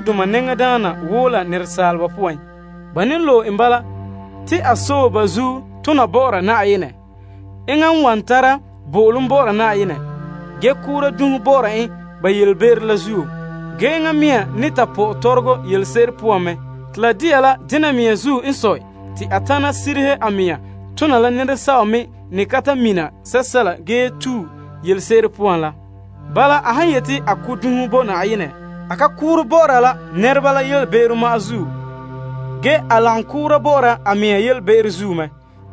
Malema nɛŋadaana woo yɛhere la nɛresaaleba poan. Ba loe en bala, te a sɔe ba zuo tone bɔ'ɔra Na'ayenɛ. Enŋa n wan tara bo'olom bɔ'ɔra Na'ayenɛ ge koora dunhe bɔ'ɔra en nɛreba yelebe'ero la zuo. Enŋa mɛŋa me ne ta pɔ'ɛ tɔrɔgɔ yelese'ere poan mɛ. Te la de'a la dena mea zuo n sɔe te a tana sirihe a mɛŋa tona la nɛresɛba me n ne ka ta mina sɛla ge ne tue yelese'ere poan la. Bala, a han yeti a ko' dunhe bo Na'ayenɛ, a ka koore bɔ'ɔra la nɛreba la yelebe'ero ma'an zuo ge a lagom koora bɔ'ɔra a mea yelebe'ero zuo mɛ.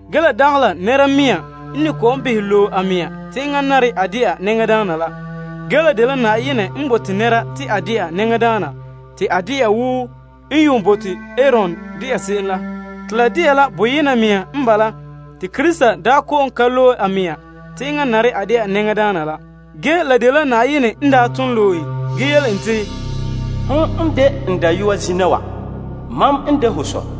Ge la dagɛ la nɛra mea n ne kɔ'ɔn behɛ loe a mɛŋa te enŋa nare a dɛna malema nɛŋadaana la. La dela Na'ayenɛ n bote nɛra te a dɛna malema nɛŋadaana te a dɛna wo n yuun bote Aron dɛna se'em la. Te la de'a la boyena mea n bala te Krista daa ka kɔ'ɔn loe a mea te enŋa nare a de'a malema nɛŋadaana la. Ge, la dela Na'ayenɛ n daa ton loe en ge yele en te, Zina wa ho dela mam Dayɔa te mam mɛ dɛna ho Sɔ.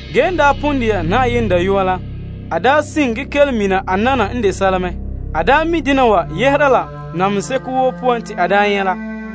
En pon dɛna Na'ayenɛ Dayɔa la, ge a sin ge kelom mina a nana n de sɛla mɛ la namehe seko woo poan te a daa nyɛ' la.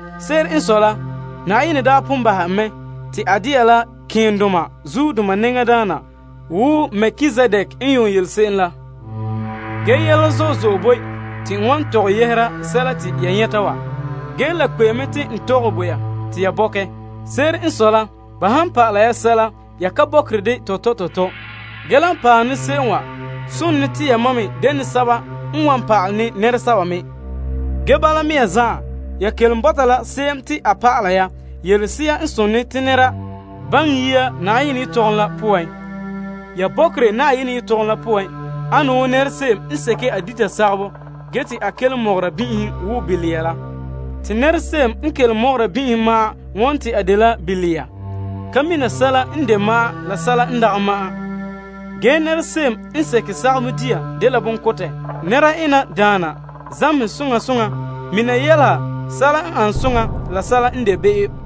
Se'ere n sɔe la, Na'ayenɛ daa pon bahɛ en mɛ te a dɛna la malema nɛŋadaana wo Melkizedek n yuun de se'em la. Ge yɛla zo'e zo'e boe te to wan tɔgɛ yɛhera sɛla te n yɛta ya wa. Ge la kpe'emɛ la n tɔgɛ bo ya te ya bɔkɛ, ya ka bɔkerɛ dɛ tɔtɔ la zuo. Ge la paɛ ne se'em wa sone te yamam me dene sɛba n wan pa'ale ne nɛresɛba me. Ge, bala mea zan'an, ya kelom bɔta la se'em te a pa'ala ya yelese'a n sontii te nɛra baŋɛ yia Na'ayenɛ yelehom la poan. Ya bɔkerɛ Na'ayenɛ yelehom poan ane wo se'em n seke a dita sagabɔ ge te a kelom mɔgɔra bin'ihom wo bilia la. Te se'em n kelom mɔgɔra bin'ihom ma'an won te a dela bilia ka mina sɛla n de ma'an la sɛla n dagɛ ma'an. Ge se'em me n sege sagabɔ dia dela bonkotɛ. Nɛra ena daana zamehɛ soŋa soŋa mina yɛleha sɛla n an soŋa la sɛla n de be'em.